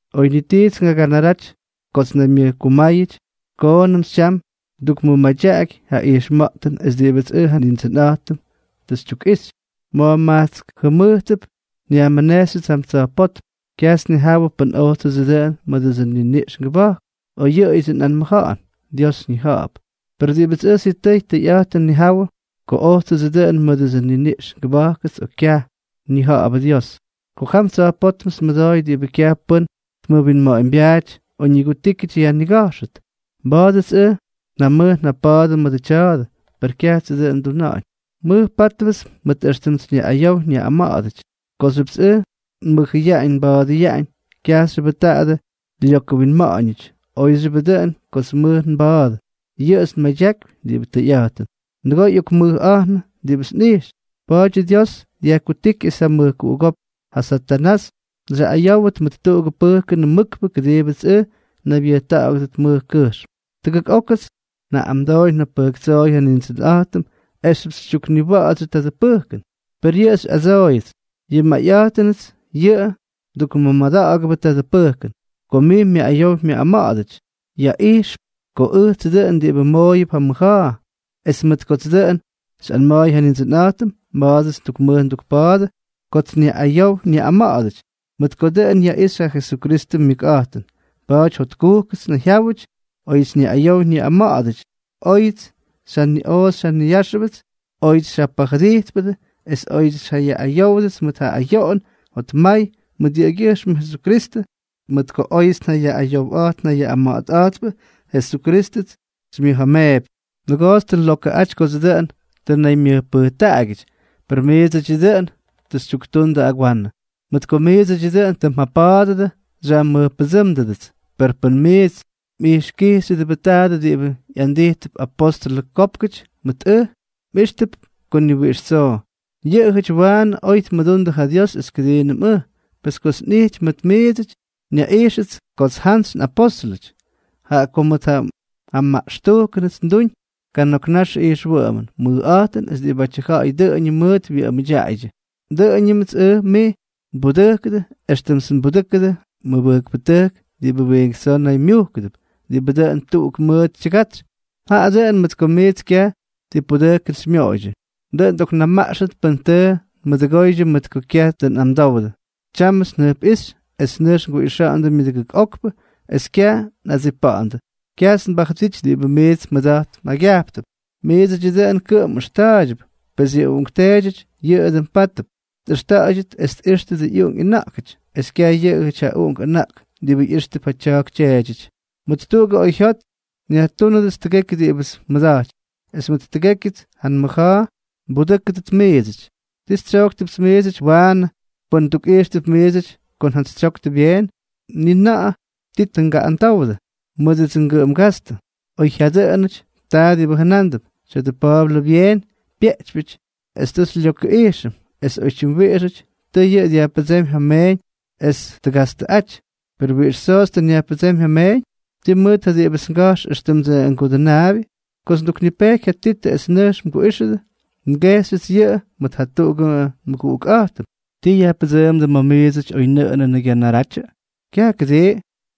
Oy ni tits ngaganaraty kots nnaymyʉjkumáyʉty, koonʉmts tyam ndukmʉmadyaꞌaky ja ijxma̱ꞌtʉn es diꞌibʉts ʉj Nindsʉnꞌa̱jtʉm tʉ xytyukꞌixy. Ma̱jma̱jkts jʉmʉjtʉp nyajmʉnejxyʉts jam tsa̱jpótm. Kyajts nnijawʉ pʉn ojtsʉdsʉ dʉꞌʉn mʉdʉts nniniꞌx ngʉba̱jk, o yʉꞌʉyʉdsʉ nꞌanmʉja̱ꞌa̱n. Dios ñija̱ꞌa̱p. Per diꞌibʉts ʉj sitʉy tʉyꞌa̱jtʉn nnijawʉ (pʉn ojtsʉdsʉ dʉꞌʉn mʉdʉts nniniꞌx ngʉba̱jkʉts o kyaj, ñija̱ꞌa̱bʉ Dios) ko jam tsa̱jpótmts nmʉdooy diꞌibʉ kyaj pʉ́n tmʉwinma̱ꞌa̱ñbyaaty o ñigutíkyʉty yajniga̱jxʉt. Mba̱a̱dʉts ʉj njamʉj njapa̱a̱dʉ mʉdʉ tya̱a̱dʉ, per kyajtsʉ dʉꞌʉn nduna̱ꞌa̱ñ; mʉjpa̱a̱dʉpts mʉt éxtʉmts nyaꞌꞌayow nyaꞌꞌama̱ꞌa̱dʉty. Kooxyʉpts ʉj nmʉjʉyaꞌañ nba̱a̱dʉyaꞌañ, kyajxyʉbʉ taadʉ lyokʉwinma̱ꞌa̱ñʉty; óyxyʉbʉ dʉꞌʉn kots nmʉj nba̱a̱dʉ, yʉꞌʉts nmadyakypy diꞌibʉ tʉyꞌa̱jtʉn. Nʉgoo ꞌyokmʉjꞌa̱jnʉ diꞌibʉts nꞌijx. Pa̱a̱dyʉ Dios dyajkutíky es ja mʉjkuꞌugópk, ja Satanás, xyaꞌꞌayówʉt mʉt tuꞌugʉ pʉjkʉnʉ mʉkpʉ kʉdiibʉts ʉj nnaybyʉjta̱ꞌa̱gʉdʉt mʉj kʉjxm. Tʉgʉk ókʉts njaꞌꞌamdooy njabʉjktsooy ja Nindsʉnꞌa̱jtʉm esxyʉpts xytyukniwa̱ꞌa̱dsyʉ tya̱dʉ pʉjkʉn. Per yʉꞌʉ xyꞌadsooyʉts: “Yʉ nmayꞌa̱jtʉnʉts yʉꞌʉ mdukmʉmada̱ꞌa̱gʉdʉbʉ tadʉ pʉjkʉn. Ko mij myaꞌꞌayow myaꞌꞌama̱ꞌa̱dʉty, yaꞌijxp ko ʉjtsʉ dʉꞌʉn diꞌibʉ mmooyʉp ja mʉja̱a̱.” Es mʉt kots dʉꞌʉn xyꞌanma̱a̱y ja Nindsʉnꞌa̱jtʉm, mba̱a̱dʉts ndukmʉj ndukpa̱a̱dʉ kots nyaꞌꞌayow nyaꞌꞌama̱ꞌa̱dʉty, mʉt ko dʉꞌʉn yaꞌixy ja Jesukristʉ myʉkꞌa̱jtʉn. Pa̱a̱ty jotkujkʉts nnayjyáwʉty óyʉts nyaꞌꞌayow nyaꞌꞌama̱ꞌa̱dʉty, óyʉts xyjaniꞌoꞌo xyjaniyáxʉbʉdʉts, óyʉts xyjapajʉdijtpʉdʉ, es óyʉts xyaꞌꞌayówdʉts mʉt ja ayoꞌon jotmay mʉt yʉꞌʉgyʉjxmʉ Jesukristʉ. Mʉt ko óyʉts njayaꞌꞌayowꞌa̱jt njayaꞌꞌama̱ꞌa̱tꞌa̱jtpʉ, Jesukrístʉts xymyʉja̱a̱meepy. Nʉgoots tʉ nlokʉꞌaty kodsʉ dʉꞌʉn tʉ nnaymyʉjpʉjtaꞌagyʉty, per miidsʉdyʉ dʉꞌʉn tʉ xytyuktundʉ agwanʉ. Mʉt ko miidsʉdyʉ dʉꞌʉn tʉ mjapa̱a̱dʉdʉ xyajmʉjpʉdsʉ́mʉdʉts, pes pʉn miits mꞌijxkijxyʉdʉbʉ tadʉ diꞌibʉ ꞌyandijtʉp apóstʉlʉ kópkʉty mʉt ʉj, mꞌíxtʉp ko ni wiꞌix tsoo yʉꞌʉjʉty waanʉ oy tmʉdundʉ ja Dios es kʉdiinʉm ʉj. Pes kots nꞌijty mʉt miidsʉty, nyaꞌijxʉts kots njantsyꞌapóstʉlʉty, jaꞌa ko mʉt ja maꞌxtujkʉnʉts nduuñ kana̱k naxʉ ijxwʉꞌʉmʉn, mʉjꞌa̱jtʉn es diꞌibʉ ja̱ꞌa̱y dʉꞌʉñʉ mʉʉt wyʉꞌʉmʉdyaꞌaydyʉ. Dʉꞌʉñʉmts ʉj miits nbudʉjkʉdʉ éxtʉmts nbudʉjkʉdʉ ja mʉbʉjkpʉtʉjk diꞌibʉ wiink tsoo naymyujkʉdʉp; diꞌibʉ dʉꞌʉn tuꞌuk mʉʉt tyʉgatsy, jaꞌa dʉꞌʉn mʉt ko miits kyaj ti pudʉjkʉn xymyooydyʉ. Dʉꞌʉn xyꞌoknamaꞌxtʉt pʉn tʉ nmʉdʉgoydyʉ mʉt ko kyaj tʉ nꞌamdowdʉ. Tyámʉts njʉjpꞌíxy es nʉjx nguꞌixa̱ꞌa̱ndʉ myʉdʉgʉk okpʉ, es kyaj nꞌadsipa̱ꞌa̱ndʉ. Kyajts nbajʉdity diꞌibʉ miits mmʉda̱jt mjaygyajptʉp, miidsʉdyʉ dʉn kʉꞌʉm nꞌʉxta̱a̱ydyʉp; pes yʉ uꞌunkteedyʉty yʉꞌʉ dʉn pátʉdʉp tꞌʉxta̱ꞌa̱ydyʉt es tꞌíxtʉdʉ ꞌyuꞌunk ꞌyʉna̱ꞌkʉty, es kyaj yʉꞌʉjʉty ja uꞌunk ʉna̱ꞌk diꞌibʉ ꞌyíxtʉp ja tya̱a̱k tyeedyʉty. Mʉt tuꞌugʉ oyjyot nyajtúnʉdʉts tʉgekyʉ diꞌibʉts nmʉda̱jtypy, es mʉt tʉgékyʉts ja nmʉja̱a̱ nbudʉ́kʉdʉt miidsʉty. ¿Tii xytsyojktʉpts miidsʉty waanʉ pʉn ndukꞌijxtʉp miidsʉty ko njantsytsyoktʉ byeen? Ni na̱ꞌa̱ ti tʉ ngaꞌꞌamdowdʉ mʉdʉdsʉ ngʉꞌʉm gastʉ, oy jyadʉꞌʉnʉty, taa diꞌibʉ jʉnándʉp: “Tya̱dʉ Pa̱a̱blʉ byeen pyeꞌtypyʉty es tʉ xylyokʉꞌijxʉm, es oytyim wiꞌixʉty tʉʉ yʉꞌʉ dyajpʉdsémy ja meeñ es tgastʉꞌaty.” ¿Per wiꞌix tsoots tʉ nyajpʉdsémy ja mmeeñ? ¿Tii mʉt ja diꞌibʉts ngajx éxtʉmdsʉ ngudʉnaabyʉ? Kots nduknipejky ja Titʉ es nʉjx mguꞌíxʉdʉ, ngejxyʉts yʉꞌʉ mʉt jatuꞌugʉ nmʉguꞌukꞌa̱jtʉm. ¿Tii yajpʉdsʉʉmdʉ ma̱ miidsʉty oynʉꞌʉnʉnʉ gyanaratyʉ? Kyaj, ¿kʉdii?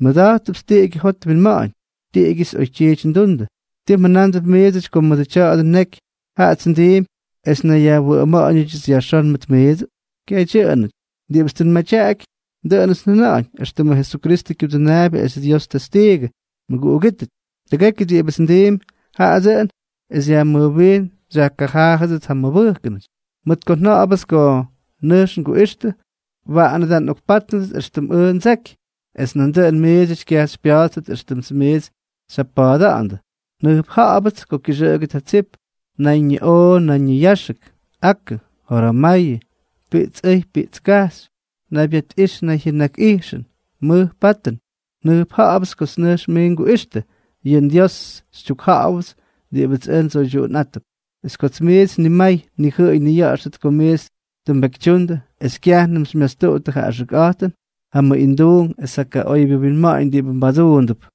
Nmʉda̱jttʉpts tiꞌigyʉ jot winma̱ꞌa̱ñ. Tiꞌigyʉts oytyiity ndundʉ. ¿Tii mjʉnándʉp miidsʉty ko mʉdʉ tya̱dʉ neky, jaꞌats ndiimpy es nnayyajwʉꞌʉma̱ꞌa̱ñʉdyʉts yajxón mʉt miidsʉ? ¡Kyaj dyʉꞌʉnʉty! Diꞌibʉts tʉ nmadyaꞌaky, dʉꞌʉnʉts njʉna̱ꞌa̱ñ éxtʉmʉ Jesukristʉ kyudʉnaabyʉ es Dios testiigʉ. Mʉguꞌugítʉty, tʉgekyʉ diꞌibʉts ndiimpy, jaꞌa dʉꞌʉn es xyajmʉjwiin xyajkajaajʉdʉt ja mmʉbʉjkʉnʉty. Mʉt ko nja̱ꞌa̱bʉts ko nʉjx nguꞌixtʉ, waꞌanʉ da ngaꞌokpátnʉt éxtʉmts ʉj ndseky, es nandʉꞌʉn miidsʉty kyajts xypya̱a̱ttʉt éxtʉmts miits xyjapa̱a̱da̱ꞌa̱ndʉ. Njʉjpja̱ꞌa̱bʉts ko kyʉxʉꞌʉgʉt ja tsip, nayñiꞌoꞌo nayñiyáxʉk, akʉ, joramayʉ, piꞌts ʉy piꞌts kajxy, naybyatꞌijx nayjyʉnakꞌijxʉn, mʉj patʉn. Jʉjpja̱ꞌa̱pts kots nʉjx nguꞌixtʉ, yʉ nDiósʉts xytyukjáwʉpts diꞌibʉts ʉj ndsoydyuꞌunꞌátʉp, es kots miits nimay nnijʉꞌʉy nniya̱ꞌa̱xtʉt ko miits tʉ mbekytyundʉ es kyajnʉm xymyastuꞌuttʉ ja axʉkꞌa̱jtʉn, ja mʉꞌinduunk es ja kaꞌoybyʉ winma̱ꞌa̱ñ diꞌibʉ mbaduundʉp.